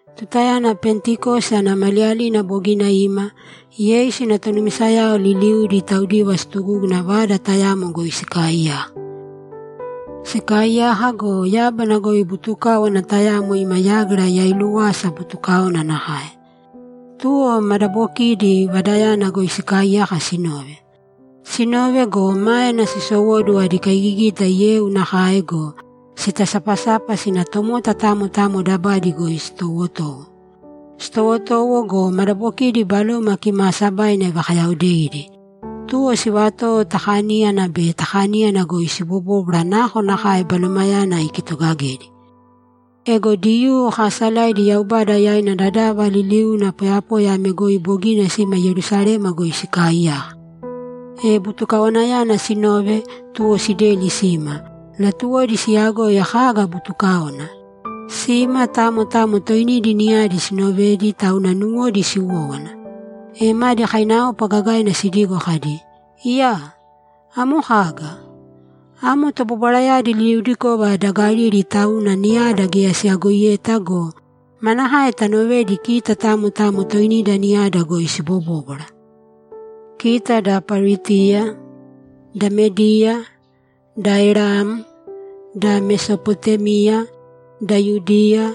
Tutayana Pentikosi ana maliyalina bogina ima, Yeisu ina tonumisayao liliudi taudiva situgúguna vada tayamo goi sikaaiyaka. Sikaaiyaka go, yábana goi butukáwana tayamo ima yágira yailúwasa butukáona nakae. Tuwo madabokiidi vadayana goi sikaaiyaka sinove. Sinove go, máena sisowóduwo adi kaigigita yeu nakae go, sitasapasapa sina tomota tamo tamo dabadi goi sitowotowo. Sitowotowo go, madabokidi Baloma Kimaasabaina ivakayaodeidi, tuwo sivatowo ta kaníyana be ta kaníyana goi sibobóbwara nakonakae Balomayana ikitogagedi. Ego Diyuu kaasalaidi Yaubada yaina dadava liliuna poyapoya ame goi bogina sima Yerusalema goi sikaaiyaka. E butukawanayana sinove, tuwo sideli sima; latuwodi siyagoi kaga butukáona. Sima, tamo tamo toinidi niyadi sinovedi, tauna nuwodi siwówana. E madi kainaopa gagaina sidigo kadi, ‘Iyaa! Amo kaga? Amo tobobwarayadi liliudikova da Galili, tauna niyada geya siyagoidita go, manakae tanovedi kita tamo tamo toinida niyada goi sibobóbwara? Kita da Paritiya, da Mediya, da Elam, da Mesopotémia, da Yudiya,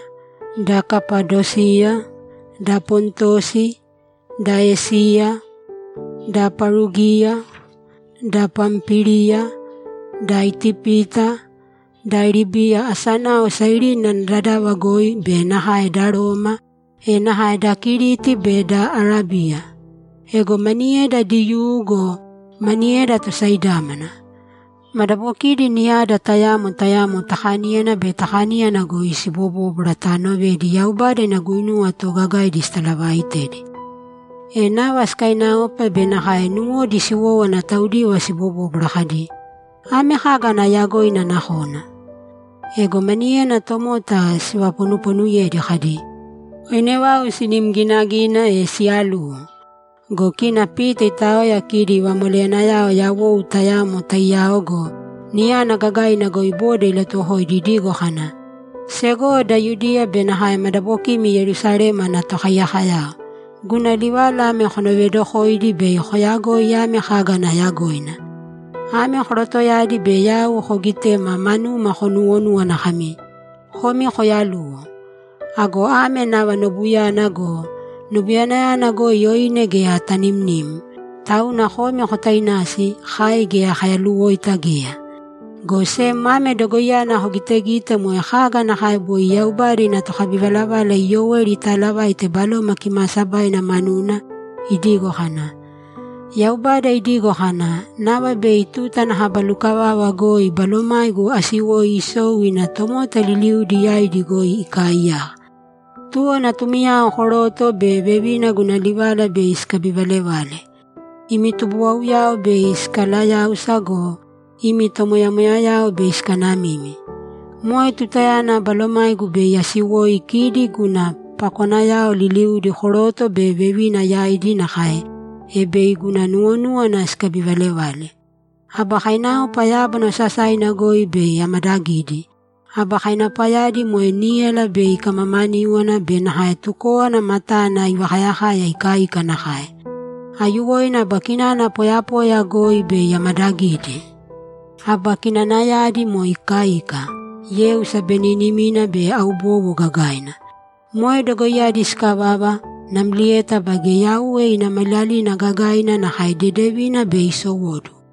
da Kapadosiya, da Pontosi, da Esiya, da Parugiya, da Pampíliya, da Itipita, da Libiya asainao Sairini ana dadava goi be nakae da Roma, e nakae da Kiriti be da Arábiya. Ego maniyeda Diyuu go, maniyeda tosaidámana. Madabokidi niyada tayamo tayamo ta kaníyana be ta kaníyana goi sibobóbwara taanovedi Yaubada ina guinuwa toogagaidi sitalavaaitedi.’ E nava sikaiinaopa be nakae nuwodi siwowówana taudiva sibobóbwara kadi, ‘Ame kaga ana yagoina nakona?’ Ego maniyena tomota sivaponupoonuyedi kadi, ‘Oine vau sinim ginagina, e siyaluwo!’ Go kina Pita itaoya kidi vamoleyanayao yawou tayamo taiyao go, niyana gagaina goi boda ilatuwokoidi idigo kana, ‘Segowo da Yudiya be nakae madabokimi Yerusalema ana tokaiyakoyao, guna livala ame konovedokōidi bei koyagoi ame kaga ana yagoina. Ame korotoyadi be yau koogitema manuma konuwonúwana kami, “Komi koyaluwo.” Ago ame nava nobuyana go! Nobuyana goi oine geya tanimnim, tauna komi kotainasi; kai geya kayaluwoita geya! Go sem ame dogoiyana kogitegite moe kaga nakae boi Yaubada ina tokabivalavala Iyoeli italavaite Baloma Kimaasabaina manuna; idigo kana, “Yaubada idigo kana, ‘Nava bei tuta ana kaba lukavava goi Balomaigu asiwoi isou ina tomota liliudi yaidi goi ikaaiyaka. Tuwo natumiyao koroto be vevina guna livala bei sikabivalevale. Imi tubuwauyao bei sikalayáusa go, imi tomoyamoyayao bei sikanamimi. Moe tutayana Balomaigu bei asiwoi isou ina kidi guna pakonayao liliudi koroto be vevina yaidi nakae, e bei guna nuwonúwana sikabivalevale. Aba kainaopa yábana osasaina goi bei amadagidi. Aba kainaopayadi moe níyala bei ikamamaníwana be nakae tukówana matana ivakayakaya ikaika nakae. Aiyuwoina aba kinana poyapoya goi bei amadagidi. Aba kinanayadi moe ikaika, yeu sabeninimina be aubowo gagaina. Moe dogoiyadi sikavava, namlieta baige Yauwe ina Maliyalina gagaina nakae dedevina bei isowóduwo.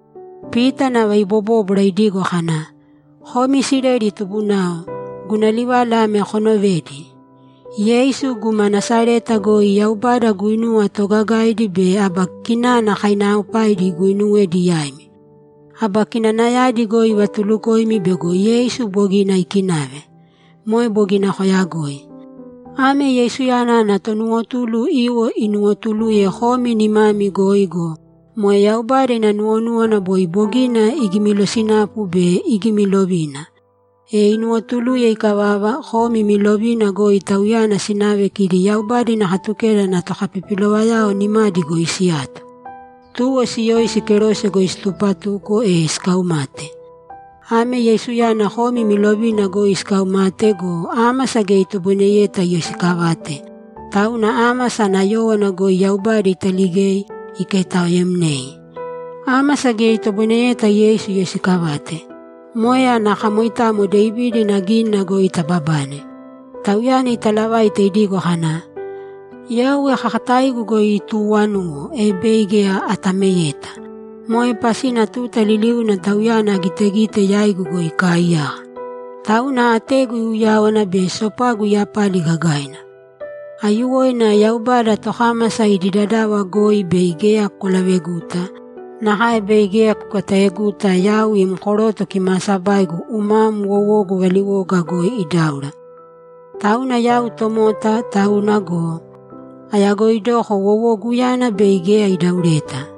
Pita nava ibobóbwara idigo kana, ‘Komi Isileli tubunao, guna livala ame konovēdi: Yeisu guma Nasareta goi Yaubada guinuwa toogagaidi be aba kinana kainaaopaidi iguinuwedi yaimi. Aba kinanayadi goi ivatulukoimi bego Yeisu bogina ikinave. Moe bogina koyagoi. Ame Yeisuyana ana tonuwotulu iwo inuwotuluye komi nimami goi go, moe Yaubada ina nuwonúwana boi bogina igimilosinapu be igimilovina. E inuwotuluye ikavava, komi imi lovina goi Tauyana sinave kidi Yaubada ina Katukeda ana tokapipilovayao nimadi goi siyato. Tuwo siyoisi, kerose goi situpatuko, e sikaumate. Ame Yeisuyana komi imi lovina goi sikaumate go, ámasa geya itoboineyeta iyoisikavate, tauna ámasa ana yówana goi Yaubada italigei, ikaitaoemnei. Ámasa geya itoboineyeta Yeisu iyoisikavate. Moe ana kamoitamo Devida ina gínina goi tababane. Tauyana italavaite idigo kana, “Yauwe kakataigu goi ituwanuwo, e bei geya atameyeta. Moe pasina tuta liliuna Tauyana agitegite yaigu goi ikaaiyaka. Tauna ategu iuyáwana be sopagu iyapali gagaina. Aiyuwoina Yaubada, tokámasa idi dadava goi bei geya kwalaveguta. Nakae bei geya kutagoneta yau im koroto kimaasabaigu umam wowogu valiwoga goi idáura. Tauna yau tomota tauna go, ayagoidoko wowoguyana bei geya idaureta.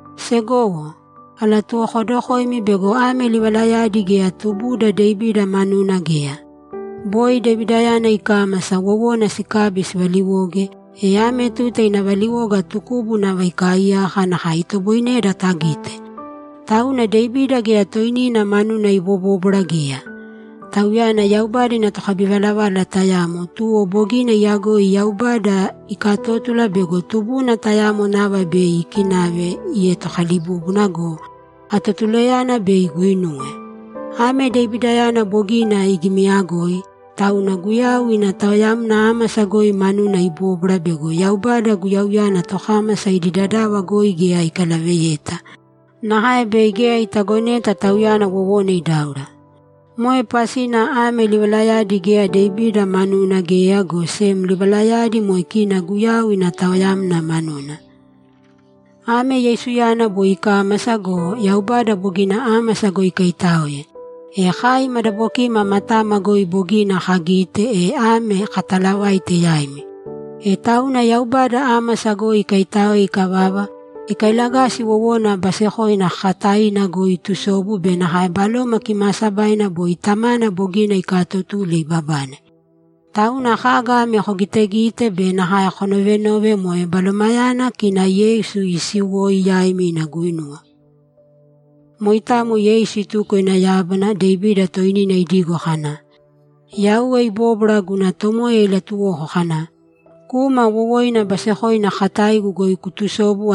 Segowo, alatuwokodokoimi bego ame livalayadi geya tubuda Devida manuna geya. Boi Devidayana ikámasa, wowona sikabi sivaliwoge, e ame tuta ina valiwoga tukubu nava ikaaiyaka, nakae itoboineda tagite. Tauna Devida geya toinina manuna ibobóbwara geya. Tauyana Yaubada ina tokabivalavala tayamo, tuwo bogina iyagoi Yaubada ikatótula bego tubuna tayamo nava bei ikinave ietokalibúbuna go, atotulayana bei iguinuwe. Ame Devidayana bogina igimiyagoi, tauna Guyau ina taoyamna ámasa goi manuna ibobóbwara bego Yaubada Guyauyana tokámasa idi dadava goi geya ikalaveyeta, nakae bei geya itagoneta Tauyana wowona idáura. Moe pasina ame livalayadi geya Devida manuna geya, go sem livalayadi moe kina Guyau ina taoyamna manuna. Ame Yeisuyana boi ikámasa go, Yaubada bogina ámasa goi ikaitáoe, e kai madabokima matama goi bogina kagite, e ame kataalavaite yaimi. E tauna Yaubada ámasa goi ikaitáoe ikavava, ikailagasi wowoina basekoina kakataina goi itusobu be nakae Baloma Kimaasabaina boi Tamana bogina ikaatotule ibabane. Tauna kaga ame kogitegite be nakae konovenove moe Balomayana kina Yeisu iisiwoi yaima ina guinuwa. Moitamo Yeisu ituko ina yábana. Devida toinina idigo kana, “Yauwe ibóbwara guna Tomoya ilatuwoko kana, ‘Kūma wowoina basekoina kakataigu goi kutusōbu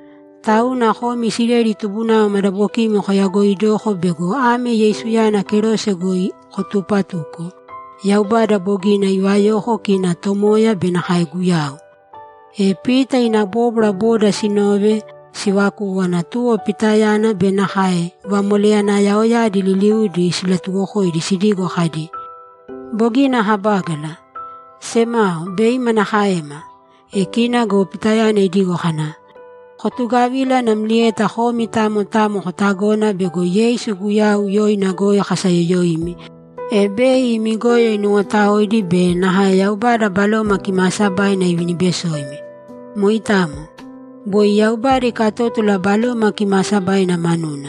Tauna komi Isileli tubunao madabokimi koyagoidōko bego ame Yeisuyana kerose goi kotupatuko, Yaubada bogina ivayoko kina Tomoya be nakae Guyau.’ E Pita ina bóbwara boda sinove, sivakúwana, tuwo Pitayana be nakae vamoleyanayaoyadi liliudi silatuwokoidi sidigo kadi, ‘Bogina kabágala! Semao, bei manakaema?’ E kina go Pitayana idigo kana, ‘Kotugavīla namlieta komi tamo tamo kotagōna bego Yeisu Guyau yoina goi kasayoyoimi, e bei imi goyo inuwotaoidi be nakae Yaubada Baloma Kimaasabaina ivinibesoimi. Moitamo. Boi Yaubada ikatótula Baloma Kimaasabaina manuna.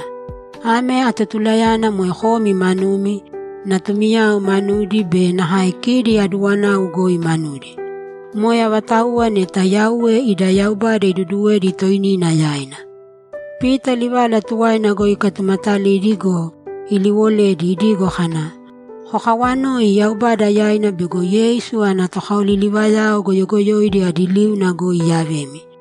Ame atotulayana moe komi manumi, natumiyao manudi be nakae kidi aduwanau goi manudi. Moe avatauwa neta Yauwe ida Yaubada iduduwedi toinina yaina.’ Pita livala tuwaina goi ikatumatalidi go, iliiwoledi idigo kana, ‘Kokawanōi Yaubada yaina bego Yeisu ana tokaoliliwoyao goyogoyoidi adi liuna goi iyavemi!’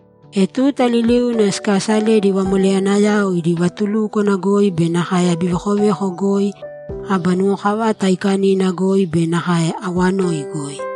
E tuta liliuna sikaasaledi vamoleyanayao idi vatulúkwana goi be nakae abivekoveko goi, aba nuwokavata aikanina goi be nakae awanoi goi.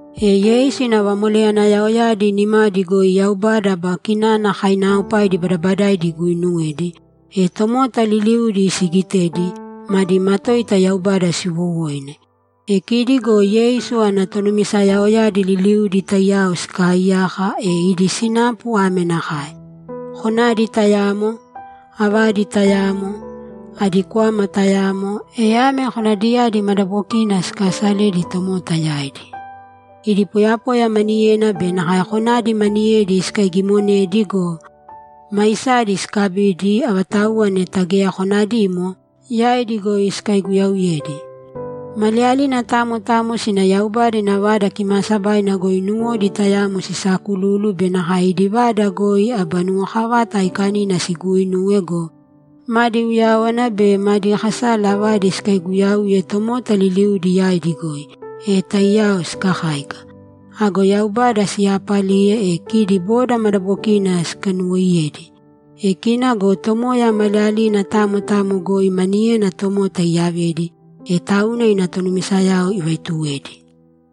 E Yeisu ina vamoleyanayaoyadi nimadi goi Yaubada aba kinana kainaaopaidi badabadaidi iguuinuwedi, e tomota liliudi sigitedi, madi matoita Yaubada siwoowoine. E kidi go Yeisu ana tonumisayaoyadi liliudi taiyao sikaaiyaka, e idi sinapu ame nakae: Konadi tayamo, avadi tayamo, adi kwama tayamo, e ame konadiyadi madabokina sikasaledi tomota yaidi. Idi poyapoya maniyena be nakae konadi maniyedi sikaigimonedi go, maisadi sikabidi, avatauwa neta geya konadimo, yaidi goi sikaiguyauyedi. Maliyalina tamo tamo sina Yaubada ina Vada Kimaasabaina goi nuwodi tayamo sisaakululu be nakae idi vada goi aba nuwokavata aikanina siguuinuwe go, madi uyáwana be madi kasala avadi sikaiguyauye tomota liliudi yaidi goi, e taiyao sikakáika. Ago Yaubada siyaapaliye, e kidi boda madabokina sikanuwoiyedi. E kina go Tomoya maliyalina tamo tamo goi maniyena tomota iyavedi, e tauna ina tonumisayao ivaituwedi.